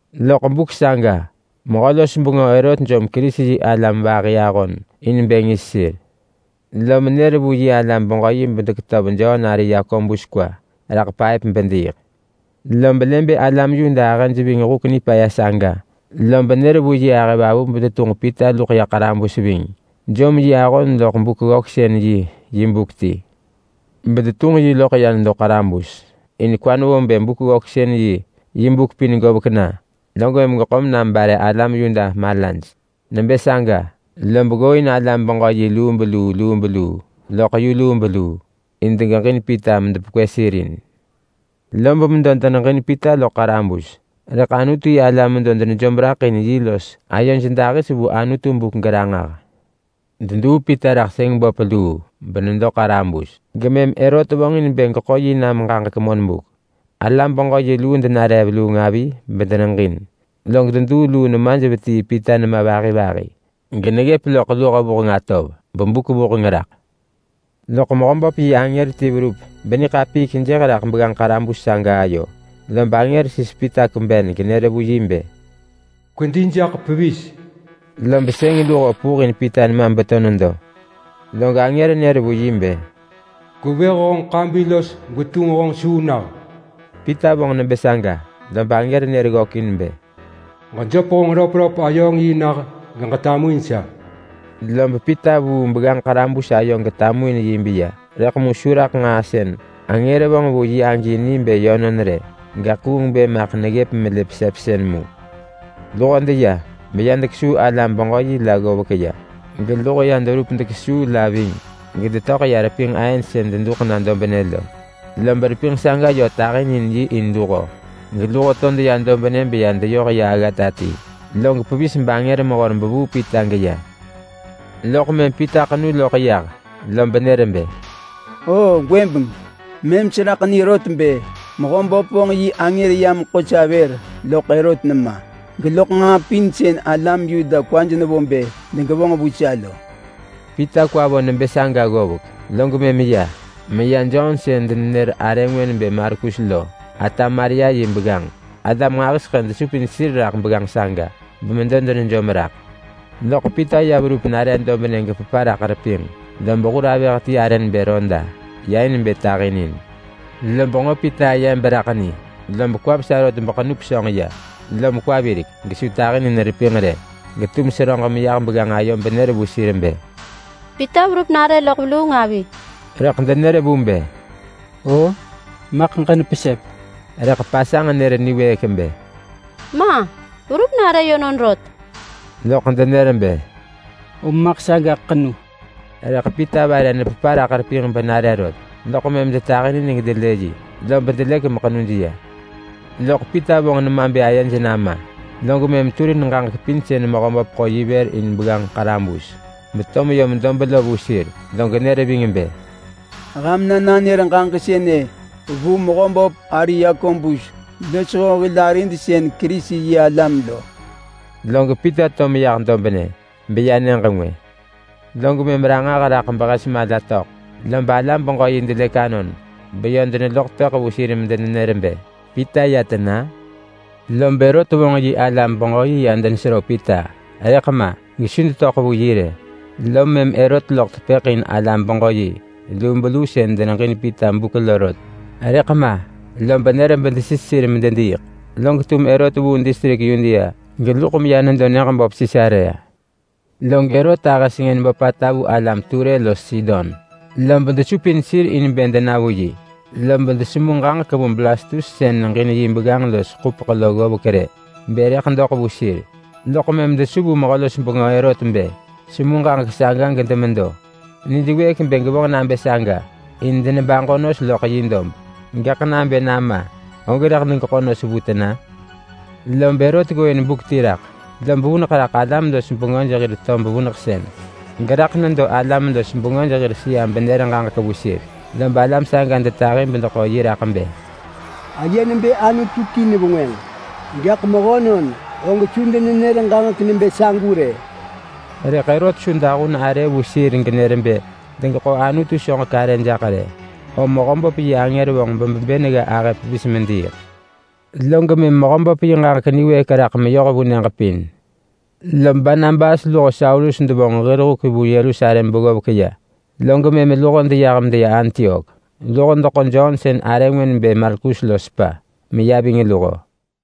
Loḳ buk saga mehö-los-bengö Herot jom Kerisi-yi-alam vahi ahon in bë ngis sir. Lom nër vu yi alam-beġö-yi bedeketöv Jon ari Yakobus kwa raḳ paëp bediiḳ. Lob lë bë alam Yuda ahëj ving huk nipaya saga, lob nër vu yi ahëvavu bedetunġ Pita luḳ ya ḳarabus ving. Jom yi ahon loḳ Buk-ggöksën-yi yi buk ti, betunġ yi loḳ ya nedo ḳarabus, in kwa nevo bë Buk-ggöksën-yi yi buk pin govek na log mëm geḳo menam bare alam Yuda malaj. Nebë saga log tato alam-beġö-yi lubeluu lubeluu yoh vu yu lubeluu in degeġin Pita medepekwë sir in. Lob medo deneġin Pita loḳ ḳarabus, rëḳ Anutu-yi-alam medo denejom raḳ in yi los ayoj dahis vu Anutu buk geranġah. Deduu Pita raḳ sëng böp luu benedo ḳarabus gemëm Herot vonġin bë geḳo yi nam ġaġek monbuk. Alam-beġö-yi luu denare veluung avi bedeneġin, log deduu luu nemaj vetii Pita nema vahi vahi geneggëp loḳ luho vuheng atov bebuk vuheng raḳ. Loḳ Mehöböp yi angër ti verup beniḳapiik jëh raḳ begganġ ḳarabus saga ayo. Lob angër sis Pita kweben genër vu yi bë, “Kwedi jaḳ pevis!” Lob sëng luho vepul in Pita nema beto nedo. Log angër nër vu yi bë, “Gwevëh honġ ḳabi los gwetunġ honġ suu nah!” Pita vonġ nebë saga, lob angër nër ggökin bë, “Ġejöp honġ röpröp-ayööng-yi nah geġetamuin sa!” Lob Pita vuu begganġ ḳarabus ayo getamuin yi beya, rëḳ mu su raḳ nġaa sën angër vonġ vu yi agi ni bë yönon rë, gaḳ kuung bë maḳ neggëp melë pesepsën mu. Luho deya, beya dekesuu alam-beġö-yi la ggovek ya, geluho ya deverup dekesuu la ving gedetöḳ ya repinġ aën sën deduḳ nah dobnë lo, lob repinġ saga yö tahinin yi in luho geluho to deya dobnë beya deyoh ya aggata ti. Log pevis bangër mehor bevuu Pita geya. Loḳ mëm Pita ḳenu loḳ yah lob nër bë, “O gwëbeng mëm seraḳ ni rot bë Mehöböp vonġ yi angër yam ḳo sa vër loḳ Herot nema, geloḳ nġaa pin sën alam Yuda kwaj nevo bë degevonġ vu sa lo.” Pita kwa vo nebë saga ggovek, log mëm ya meya Jon sën denenër arë ngwë nebë Markus lo ata Maria yi begganġ. Alam nġahiseḳë desupin sir raḳ begganġ saga bemedo denejom raḳ. Log Pita ya verup nare dobnë gepepa raḳ repinġ, lob hur avëh ti arë nebë Roda ya in bë tahinin. Lob nġo Pita aye beraḳ ni lob kwa vesa rot beḳenu pesönġ ya, lom kwa virek gesu tahinin repinġ rë, gaḳ seröġ meyah begganġ ayo benër vu sir bë, “Pita verup nare loḳ veluung avi!” Rëḳ denër vu bë, “O! Maḳ ġenepesep!” Rëḳ pasanġ nër niwëëk bë, “Ma! Verup nare yönon rot!” Loḳ denër bë, “Om maḳ sagaḳ ḳenu!” Rëḳ Pita vare nepepa raḳ repinġ benare rot, loḳ mëm detahinin gedelë yi, lob delëk meḳenuj ya. Loḳ Pita vonġ nema bë ayej nama, log mëm turin ġaġek pin sën Mehöböp ḳo yi vër in begganġ ḳarabus beto meyom dob lo vu sir. Log nër ving bë, “Ham na nanër ġaġek sënë vu Mehöböp ari Yakobus losho hil arid sën Kerisi-yi-alam lo.” Log Pita to meyah dobnë, beya nyëġ ngwë. Log mëm ranġah raḳ behes mala töḳ lob alam-beġö-yi delëk anon beyö deneloḳ tepëḳ vu sir medenenër bë, “Pita ya tena?” Lob Herot vonġ yi alam-beġö-yi ya denesero Pita, rëḳ ma gesu detöḳ vu yi rë. Lom mëm Herot loḳ tepëḳ in alam-beġö-yi lubeluu sën deneġin Pita buk lo rot. Rëḳ ma lob nër bedesis sir medediiḳ, log tum Herot vuu distrik Yudea geluḳ meya nedo nyëġ böp Sisarea. Log Herot ahë sengën böpata vu alam Ture los Sidon, lob desupin sir in bë dena vu yi. Lob desemu ġaġek vu Blastus sën neġin yi begganġ los ḳupeḳ lo ggovek rë bë rëḳ doḳ vu sir, loḳ mëm desu vu mehö-los-bengö Herot bë semu ġaġek saga gedemedo. Nij wëëk bë gevonġ nabë saga in denebaġo nos loḳ yi dob, gaḳ nabë nama, og rëḳ degeḳo nos vu tena? Lob Herot ggooin buk ti raḳ, lob vuneḳ raḳ alam-los-bengöj hir tob vuneḳsën, geraḳ nedo alam-los-bengöj hir sëa benër ġaġek vu sir. Lob alam saga detahi bedeḳo yi raḳ bë, “Aye nebë anutu ti nevengwënġ! Gaḳ mehönon og su denenër ġaġek nebë sagu rë!” Rëḳ Herot su dahun arë vu sir genër bë degeḳo Anutu soġek arë jaḳ rë, om Mehöböp yi angër vonġ bebebën gga ahë pevis mediiḳ. Log Mehöböp yi ġaġek niwëëk raḳ meyoh vu nyëġ pin. Lob Barnabas luho Saulus devonġ hir huk vu Yerusalem beggovek ya, log mëm luho deyah medeya Antiok. Luho deḳo Jon sën arë ngwë nebë Markus lo sepa, meya ving luho.